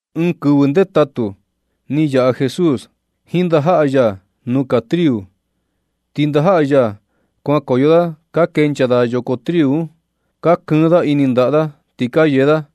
Ɨɨn kɨvɨ ndetatu ni yaꞌa Jesús jiin ndajaꞌa ya nuu kaa triu. Ti ndajaꞌa ya kuankoyo da ka kenchaa da yoko triu un, ka kɨɨn da ini ndaꞌa da ti ka yee da.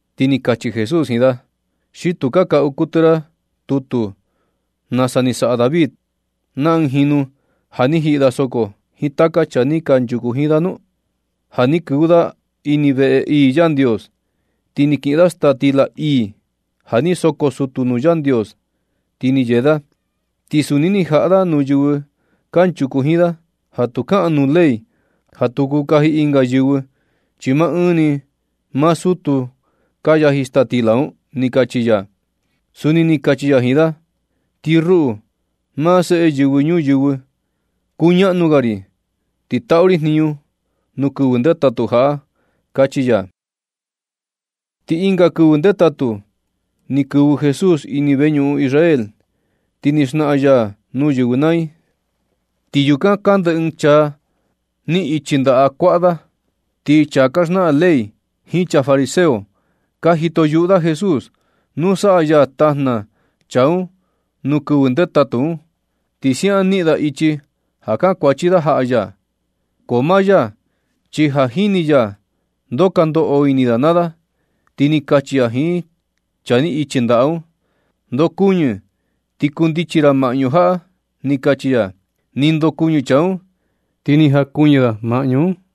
Ti ni kachi Jesús jiin da: ―¿Xi tu ni ka kaꞌu kuɨtɨ ra tutu nasa ni saꞌa David na ɨɨn jinu ja ni jiꞌi da soko jiin taka chaa ni kanchuku jiin da nu? Ja ni kɨvɨ da ini veꞌe ii Yandios, ti ni kiꞌin da staa stila ii ja ni soko sutu nuu Yandios, ti ni yee da. Ti suni ni jaꞌa da nuu yɨvɨ kanchuku jiin da, ja tu kaꞌan nuu ley ja tu kuu kaji ɨnga yɨvɨ, chi maa ni maa sutu kuu ja yaji staa stila un ―ni kachi ya. Suni ni kachi ya jiin da: ―Ti ruꞌu, maa Seꞌe Yɨvɨ Ñuyɨvɨ, kuñaꞌnu ga ri ti taꞌu ri jniñu nuu kɨvɨ ndetatu jaꞌa―kachi ya. Ti ɨnga kɨvɨ ndetatu, ni kɨvɨ Jesús ini veñuꞌun Israel, ti ni xnaꞌan ya nuu yɨvɨ naa i. Ti yukan kande ɨɨn chaa ni ichi ndaꞌa kuaꞌa da. Ti chaa ka xnaꞌan ley jiin chaa fariseo, ka jito yuꞌu da Jesús ja nu saꞌa ya tajna chaa un nuu kɨvɨ ndetatu un, ti siaꞌan niꞌin da ichi ja kankuachi da jaꞌa ya. Ko maa ya chi ja jini ya ndoo ka ndoꞌo ini da naa da, ti ni kachi ya jiin chaa ni ichi ndaꞌa un: ―Ndokuɨñɨ ti kundichi ra maꞌñu jaꞌa―ni kachi ya. Ni ndokuɨñɨ chaa un ti ni jakuɨñɨ da maꞌñu un.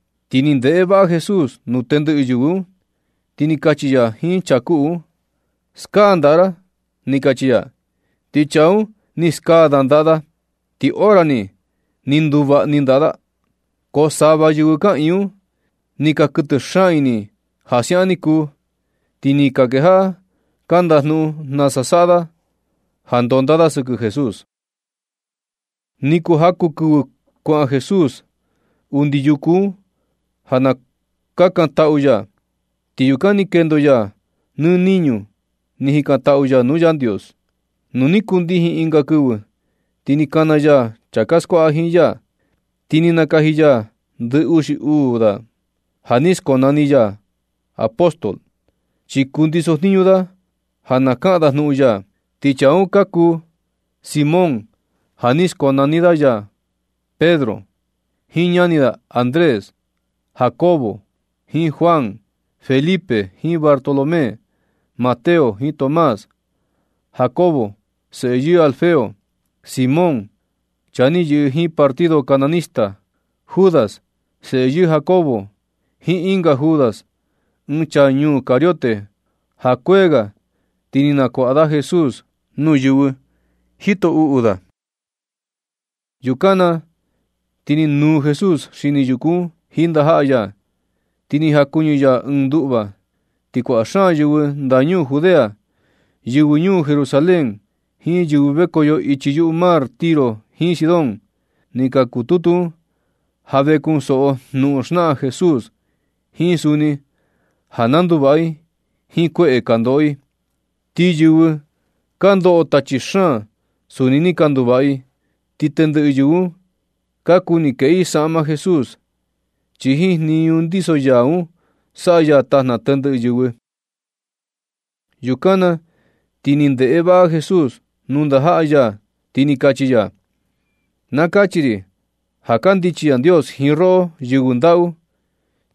Ti ni ndeꞌe vaꞌa Jesús nuu tendɨꞌɨ yɨvɨ un, ti ni kachi ya jiin chaa kuꞌu un: ―Skaa ndaꞌa ra ―ni kachi ya. Ti chaa un ni skaa da ndaꞌa da, ti hora ni, ni nduvaꞌa ndaꞌa da. Ko sava yɨvɨ kaꞌiin un, ni ka kuɨtɨ xaan ini ja siaꞌan ni kuu, ti ni ka kejaꞌa ka ndajnuꞌun nasa saꞌa da ndonda da sɨkɨ Jesús. Ni kuu jaku kɨvɨ kuaꞌan Jesús undi yuku un ja kakantaꞌu ya, ti yukan ni kendo ya nɨ niñu ni jikantaꞌu ya nuu Yandios. Nu ni kundijin ɨnga kɨvɨ ti ni kana ya chaa ka skuaꞌa jiin ya, ti ni nakaji ya ndɨ uxi uu da, ja ni skonani ya da apóstol, chi kundiso jniñu da ja na kaꞌan da jnuꞌun ya. Ti chaa un ka kuu Simón ja ni skonani ya da Pedro, jiin ñani da Andrés; Jacobo jiin Juan; Felipe jiin Bartolomé; Mateo jiin Tomás; Jacobo, seꞌe yɨɨ Alfeo; Simón, chaa ni yɨꞌɨ jiin partido cananista; Judas, seꞌe yɨɨ Jacobo; jiin ɨnga Judas, ɨɨn chaa ñuu Cariote ja kuee ga ti ni nakuaꞌa da Jesús nuu yɨvɨ jito uꞌu da. Yukan na ti ni nūū Jesús xini yuku un jiin ndajaꞌa ya, ti ni jakuɨñɨ ya ɨɨn nduꞌva. Ti kuaꞌa xaan yɨvɨ ndañuu Judea, yɨvɨ ñuu Jerusalén jiin yɨvɨ vekoyo ichi yuꞌu mar Tiro jiin Sidón, ni ka kututu un ja ve kunsoꞌo jnuꞌun xnaꞌan Jesús, jiin suni ja na nduvaꞌa i jiin kueꞌe ka ndoꞌo i. Ti yɨvɨ ka ndoꞌo tachi xaan suni ni ka nduvaꞌa i. Ti tendɨꞌɨ yɨvɨ un ka kuni kueꞌe i saꞌma Jesús, chi jiin jniñu ndiso ya un saꞌa ya tajna tendɨꞌɨ yɨvɨ. Yukan na ti ni ndeꞌe vaꞌa Jesús nuu ndajaꞌa ya ti ni kachi ya: ―Na kachi ri ja kandichi Yandios jiin roꞌo yɨvɨ ndaꞌu,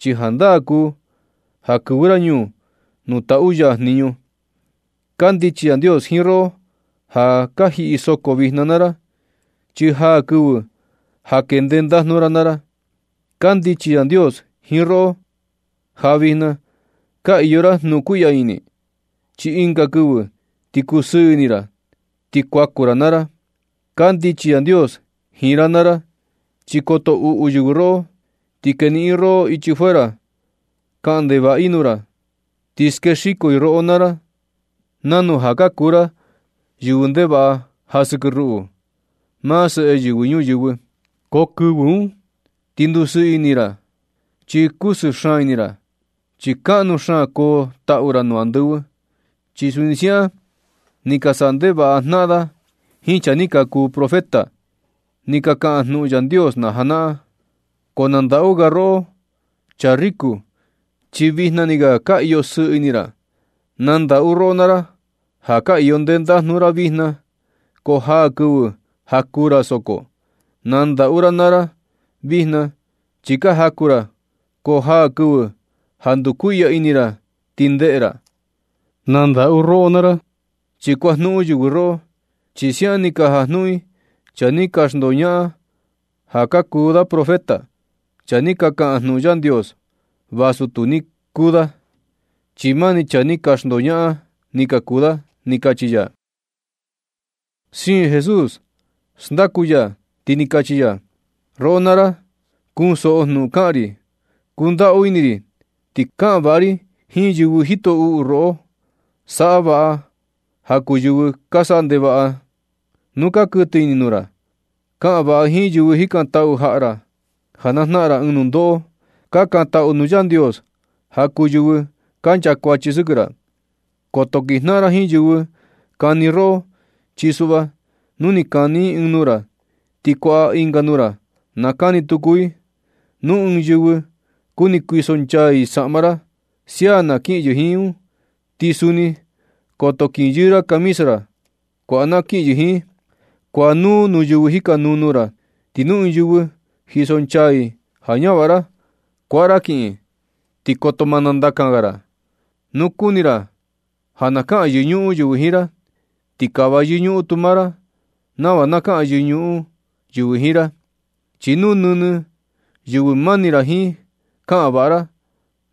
chi jandaa kuu ja kɨvɨ ra ñuu nuu taꞌu ya jniñu. Kandichi Yandios jiin roꞌo ja ka jiꞌi soko vijna naa ra, chi jaa kɨvɨ ja kee ndendajnu ra naa ra. Kandichi Yandios jiin roꞌo ja vijna ka iyo ra jnukuiꞌya ini, chi ɨnga kɨvɨ ti kusɨɨ ini ra, ti kuaku ra na ra. Kandichi Yandios jiin ra naa ra, chi koto uꞌu yɨvɨ roꞌo ti keniꞌin i roꞌo ichi fuera, kaꞌan ndevaꞌa i nuu ra, ti skexiko i roꞌo naa ra nanu ja ka kuu ra yɨvɨ ndevaꞌa ja sɨkɨ ruꞌu, maa Seꞌe Yɨvɨ Ñuyɨvɨ. Ko kɨvɨ un ti ndusɨɨ ini ra, chi kusɨɨ xaan ini ra, chi kaꞌnu xaan koo taꞌu ra nuu andɨvɨ, chi suni siaꞌan ni ka saꞌa ndevaꞌa jnaꞌan da jiin chaa ni ka kuu profeta, ni ka kaꞌan jnuꞌun Yandios na janaꞌan. Ko na ndaꞌu ga taka roꞌo chaa riku, chi vijna ni ga ka iyo sɨɨ ini ra. Na ndaꞌu roꞌo naa ra ja ka iyo ndendajnu ra vijna, ko jaa kɨvɨ ja kuu ra soko. Na ndaꞌu ra naa ra, vijna chi ka jaku ra, ko jaa kɨvɨ ja ndukuiꞌya ini ra ti ndeꞌe ra. Na ndaꞌu ra naa ra, chi kuajnuꞌun yɨvɨ roꞌo, chi siaꞌan ni ka jajnuꞌun i chaa ni ka xndoñaꞌan ja ka kuu da profeta, chaa ni ka kaꞌan jnuꞌun Yandios vasu tu ni kuu da, chi mani chaa ni ka xndoñaꞌan ni ka kuu da ―ni kachi ya. Siin Jesús xndaku ya, ti ni kachi ya: ―Ko roꞌo naa ra kunsoꞌo jnuꞌun na kaꞌan ri. Kundaꞌu ini ti kaꞌan vaꞌa ra jiin yɨvɨ jito uꞌu roꞌo. Saꞌa ja vaꞌa ja kuu yɨvɨ ka saꞌa ndevaꞌa nuu ka kuɨtɨ ini i nuu ra. Kaꞌan vaꞌa jiin yɨvɨ jikantaꞌu jaꞌa ra ja na jnaꞌan ra ɨɨn nundoꞌo. Kakantaꞌu nuu Yandios ja kuu yɨvɨ ka chakuachi sɨkɨ ra. Koto kinjnaꞌan ra jiin yɨvɨ kani roꞌo, chi suꞌva nu ni kani ɨɨn nuu ra, ti kuaꞌa ɨnga nuu ra na kani tuku i. Nu ɨɨn yɨvɨ kuni kuisonchaa i saꞌma ra, sia na kiꞌin yɨvɨ un jiin, ti suni koto kinyɨɨ ra camisa ra, kuaꞌa na kiꞌin yɨvɨ un jiin. Kuaꞌa nuu nuu yɨvɨ jikanuu nuu ra, ti nu ɨɨn yɨvɨ jisonchaa i ja ñavaꞌa ra, kuaꞌa ra kiꞌin, ti koto ma nandakan ga ra. Nu kuni ra ja na kaꞌan yɨñuꞌun yɨvɨ jiin ra, ti kava yɨñuꞌun tu maa ra nava na kaꞌan yɨñuꞌun yɨvɨ jiin ra. Chi nu nɨnɨ yɨvɨ mani ra jiin kaꞌan vaꞌa ra,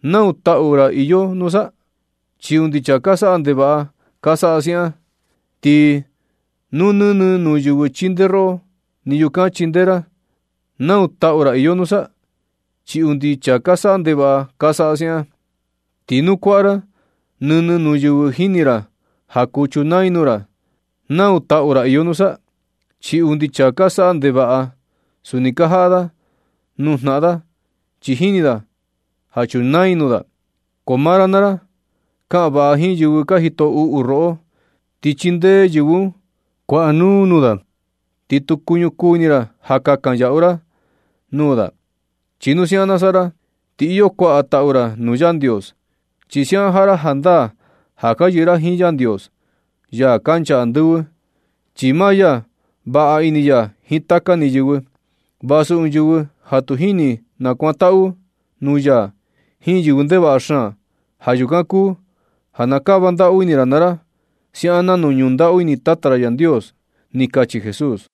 ¿Nau taꞌu ra iyo nusa? Chi undi chaa ka saꞌa ndevaꞌa ka saꞌa siaꞌan. Ti nu nɨnɨ nuu yɨvɨ chindee roꞌo ni yukan chindee ra, ¿nau taꞌu ra iyo nusa? Chi undi chaa ka saꞌa ndevaꞌa ka saꞌa siaꞌan. Ti nu kuaꞌa ra nɨnɨ nuu yɨvɨ jini ra ja kuu chunaa i nuu ra, ¿nau taꞌu ra iyo nusa? Chi undi chaa ka saꞌa ndevaꞌa, suni ka jaꞌa nuu nuu jnaꞌan da, chi jini da ja chunaa i nuu da. Ko maa ra naa ra, kaꞌan vaꞌa jiin yɨvɨ ka jito uꞌu roꞌo, ti chindee yɨvɨ un. Kuaꞌa nuu nuu da, ti tu kuñukuu ini ra ja kakan ra yaꞌu nuu da. Chi nu siaꞌan saꞌa ra, ti iyo kuaꞌa taꞌu ra nuu Yandios, chi siaꞌan jaꞌa ra jandaa ja ka yɨꞌɨ ra jiin Yandios, ya kancha andɨvɨ. Chi maa ya vaꞌa ini ya jiin taka ni yɨvɨ, vasu ɨɨn yɨvɨ ja tu jini nakuantaꞌu nuu ya jiin yɨvɨ ndevaꞌa xaan. Ja yukan kuu ja na kava ndaꞌu ini ra naa ra, siaꞌan nanu ñundaꞌu ini Tata ra Yandios ―ni kachi Jesús.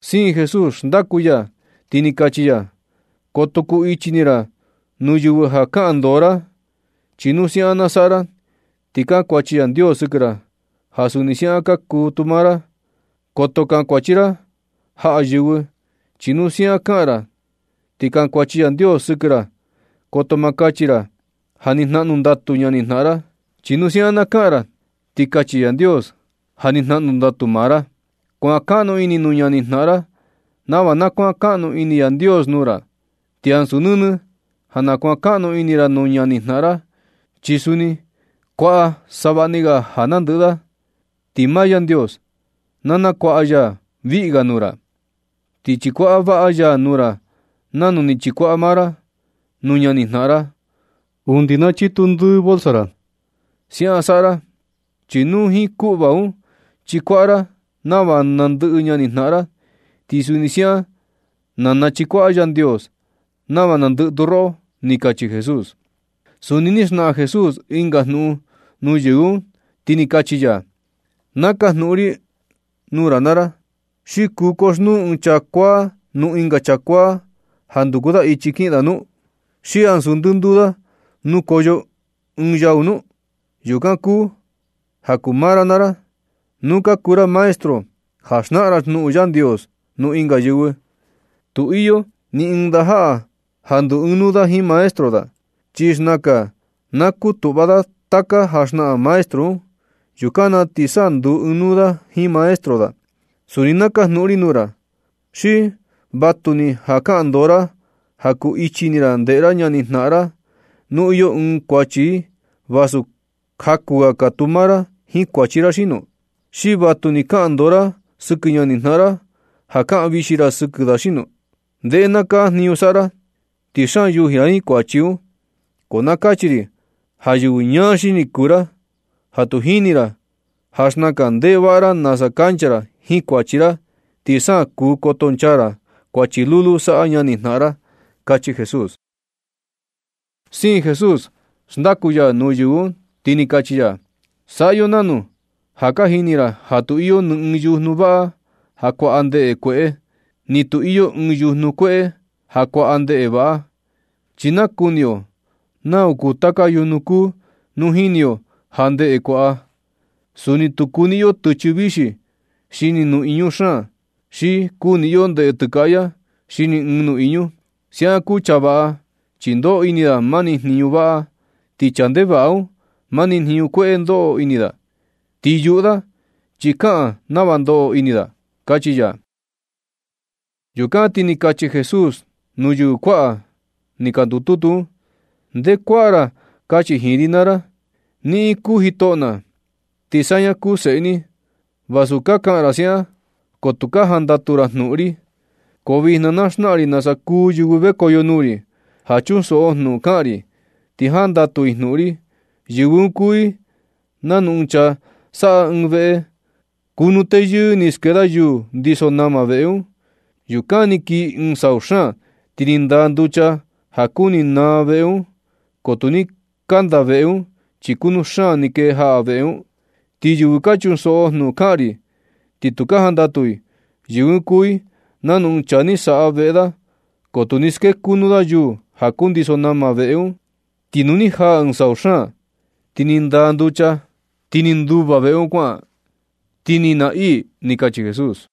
Siin Jesús xndaku ya, ti ni kachi ya: ―Koto kuu ichi ini ra nuu yɨvɨ ja kaꞌan ndoo ra. Chi nu siaꞌan na saꞌa ra, ti kankuachi Yandios sɨkɨ ra, ja suni siaꞌan kaa tu maa ra. Koto kankuachi ra jaꞌa yɨvɨ. Chi nu siaꞌan kaꞌan ra ti kankuachi Yandios sɨkɨ ra. Koto ma kachi ra ja ni jnaꞌnu ndatu ñanijnaꞌan ra. Chi nu siaꞌan na kaꞌan ra, ti kachi Yandios ja ni jnaꞌnu ndatu maa ra. Kuankaꞌnu ini nuu ñanijnaꞌan ra nava na kuankaꞌnu ini Yandios nuu ra. Ti ansu nɨnɨ ja na kuankaꞌnu ini ra nuu ñanijnaꞌan ra, chi suni kuaꞌa savaꞌni ga ja nandɨꞌɨ da, ti maa Yandios na nakuaꞌa ya viꞌi ga nuu ra. Ti chikuaꞌa vaꞌa ya nuu ra nanu ni chikuaꞌa maa ra nuu ñanijnaꞌan ra undi na chitu ndɨɨ bolsa ra. Siaꞌan saꞌa ra, chi nu jiin kuꞌva un chikuaꞌa ra nava nandɨꞌɨ ñanijnaꞌan ra, ti suni siaꞌan na nachikuaꞌa Yandios nava nandɨꞌɨ tu roꞌo ―ni kachi Jesús. Suni ni xnaꞌan Jesús ɨnga jnuꞌun nuu yɨvɨ un, ti ni kachi ya: ―Na kajnuꞌun ri nuu ra naa ra. ¿Xi kuu koxnuu ɨɨn chaa kuaa nuu ɨnga chaa kuaa ja nduku da ichi kiꞌin da nu? ¿Xi ansu ndɨnduu da nukoyo ɨɨn yau nu? Yukan kuu ja kuu maa ra naa ra, nu ka kuu ra maestro ja xnaꞌan jnuꞌun Yandios nuu ɨnga yɨvɨ. Tu iyo ni ɨɨn ndajaꞌa ja ndu ɨɨn nuu jiin maestro da, chi xnakan na kutuꞌva da taka ja xnaꞌan maestro un. Yukan na ti sa ndu ɨɨn nuu da jiin maestro da. ¡Suni na kajnuꞌun ri nuu ra! ¿Xi vatuni ja kaꞌan ndoo ra ja kuu ichi ini ra ndeꞌe ra ñanijnaꞌan ra, nu iyo ɨɨn kuachi i, vasu jakuu ga kaa tu maa ra jiin kuachi ra xino? ¿Xi vatuni ja kaꞌan ndoo ra sɨkɨ ñanijnaꞌan ra, ja kaꞌan vixi ra sɨkɨ da xino? Ndeꞌe naa kaa jniñu saꞌa ra, ti xaan yuji ra jiin kuachi un. Ko na kachi ri ja yɨvɨ ñaa xini kuu ra, ja tu jini ra ja xnakan ndeꞌe vaꞌa ra nasa kancha ra jiin kuachi ra, ti sa kuu kotonchaa ra kuachi lulu saꞌa ñanijnaꞌan ra ―kachi Jesús. Siin Jesús xndaku ya nuu yɨvɨ un, ti ni kachi ya: ―Saꞌa yo nanu. Ja ka jini ra ja tu iyo ni ɨɨn yujnu vaꞌa ja kuaꞌa ndeꞌe kueꞌe, ni tu iyo ni ɨɨn yujnu kueꞌe ja kuaꞌa ndeꞌe vaꞌa. Chi nakuni yo nau nuu taka yujnu kuu nu jini yo naa ndeꞌe kuaꞌa. Suni tu kuniꞌin yo tɨchɨ vixi xini nuꞌiñu xaan, xi kuniꞌin yo ndeꞌe tɨkaꞌya xini ɨɨn nuꞌiñu. Siaꞌan kuu chaa vaꞌa, chi ndoꞌo ini da mani jniñu vaꞌa. Ti chaa ndevaꞌa un, mani jniñu kueꞌe ndoꞌo ini da. Ti yuꞌu da, chi kaꞌan nava ndoꞌo ini da ―kachi ya. Yukan ti ni kachi Jesús nuu yɨvɨ kuaꞌa ni ka ndututu un: ―Nde kuaꞌa ra kachi jiin ri naa ra: “Niꞌin kuu jitoꞌo na, ti saña kuu seꞌe ni.” Vasu ka kaꞌan ra siaꞌan, ko tu ka jandatu ra jnuꞌun ri. Ko vijna na xnaꞌan ri nasa kuu yɨvɨ vekoyo nuu ri, ja chunsoꞌo jnuꞌun kaꞌan ri, ti jandatu i jnuꞌun ri. Yɨvɨ un kuu i nanu ɨɨn chaa ni saꞌa ɨɨn veꞌe. Kunuu teyɨɨ ni skee da yuu ndiso nama veꞌe un. Yukan ni kii ɨɨn sau xaan, ti ni ndaa nducha ja kuni xnaa veꞌe un, ko tu ni kanda veꞌe un, chi kutu xaan ni kee jaꞌa veꞌe un. Ti yɨvɨ ka chunsoꞌo jnuꞌun kaꞌan ri, ti tu ka jandatu i, yɨvɨ un kuu i nanu ɨɨn chaa ni saꞌa veꞌe da, ko tu ni skee kunu da yuu ja kundiso nama veꞌe un. Ti ñuu ni jaꞌa ɨɨn sau xaan ti ni ndaa nducha, ti ni nduva veꞌe un kuaꞌan, ti ni naa ii ―ni kachi Jesús.